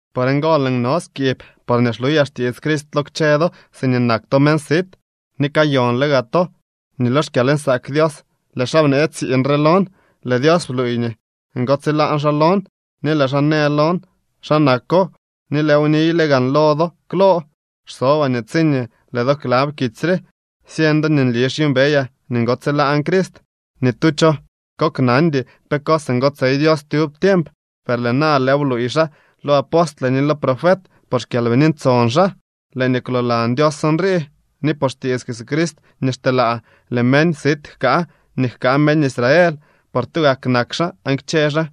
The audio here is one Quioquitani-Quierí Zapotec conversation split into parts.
Por ngo lëën no skiib porñee xluyaa xtiits Crist lo kchë do siñee nak to meñ sit. Ni kayonle gaa to nii lo xkyalnsaak Dios lëë xaa bnee tsiiñ re lon. Lëë Dios bluuy nii ngotsilaan xaa lon, ni lëë xaa në lon xa nako, ni lëëw niyle gaan lo do klo. Xsobaa nii tsiñee lëë do klab kitsy re, syeñ do nii nli xyuumbeyaa nii ngotsilaan Crist. Ni tu cho koknandy pe cos ngotsey Dios tyub tiemp, per lëë na lëëw bluuy xaa lo apostle ni lo profet por xKyalbini Ntson xaa. Lëë nii kwloolan Dios nrii: nii por xtiits Jesucrist nii xteelaa, lëë meñ sit jkaa nii jkaa meñ Israel, por tugak nak xaa aan kchë xaa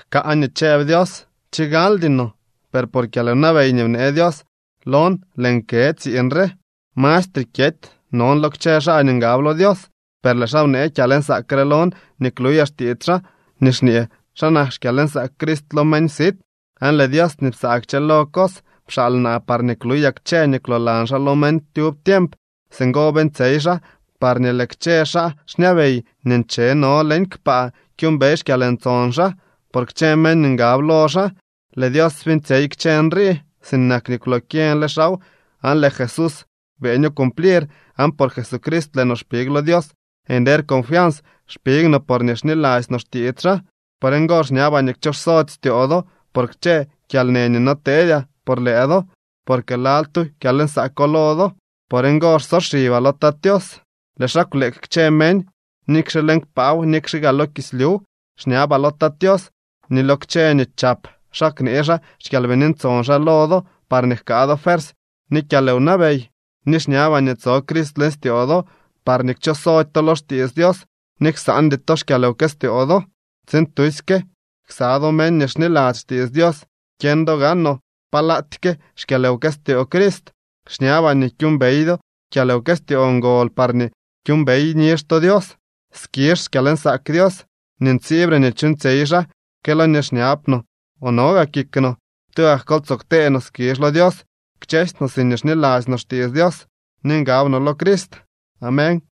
jkaa nii chëb Dios. Chigaldyno, per por kyalwnabey nii bnee Dios lon lëën kë tsiiñ re. Mastre kyety non lo kchë xaa nii ngab lo Dios, per lëë xaa bnee kyalnsaak re lon nii kluyaa xtiits xaa nii xñee xa nak xkyalnsaak Crist lo meñ sit. Aan lëë Dios nii psaa kchëlo cos pxaal naa parñee kluyaa kchë nii kwloolan xaa lo meñ tyub tiemp. Singo beeñtsyey xaa parñee lëë kchë xaa xñabey nii ncheno leñ kpaa kyuumbey xkyalntson xaa por kchë meñ nii ngab lo xaa. Lëë Dios beeñtsyey kchë nrii, sinak nii kwlokyeñle xaaw aan lëë Jesús beeño cumplir. Aan por Jesucrist lëë no xpig lo Dios. Nder confians xpig no porñee xniladzy no xtiits xaa. Por ngo xñabaa nii kchoxsody styoo do por kchë kyalnë nii noteedyaa por lëë do, porque lal tu kyalnsaako lo do. Por ngo xsoxibaa lo Tat Tios. Lëë xaa kwleek kchë meñ, nikxe leñ kpaaw nikxe gaa lo kislyuw. Xñabaa lo Tat Tios nii lo kchë nii chap xaa knee xaa xKyalbini Ntson xaa lo do parñee jkaa do fuersy ni kyalwnabey. Ni xñabaa nii tso Crist leñ styoo do parñee kchosody to lo xtiits Dios ni ksaandy to xkyalwkëstyoo do tsiin tusyke ksa do meñ nii xniladzy xtiits Dios kyeñ do gaanoo palaatyke xkyalwkëstyoo Crist. Xñabaa nii kyuumbey do kyalwkëstyoo ngol parñee kyuumbey nizh to Dios. Skizh xkyalnsaak Dios nii ntsiibre nii chuuñtsyey xaa que lo nii xñab no o no gaa kik no. ¡Tugak kol tsoo ktee no skizh lo Dios kchësy no siñee xniladzy no xtiits Dios ni ngab no lo Crist! Amén.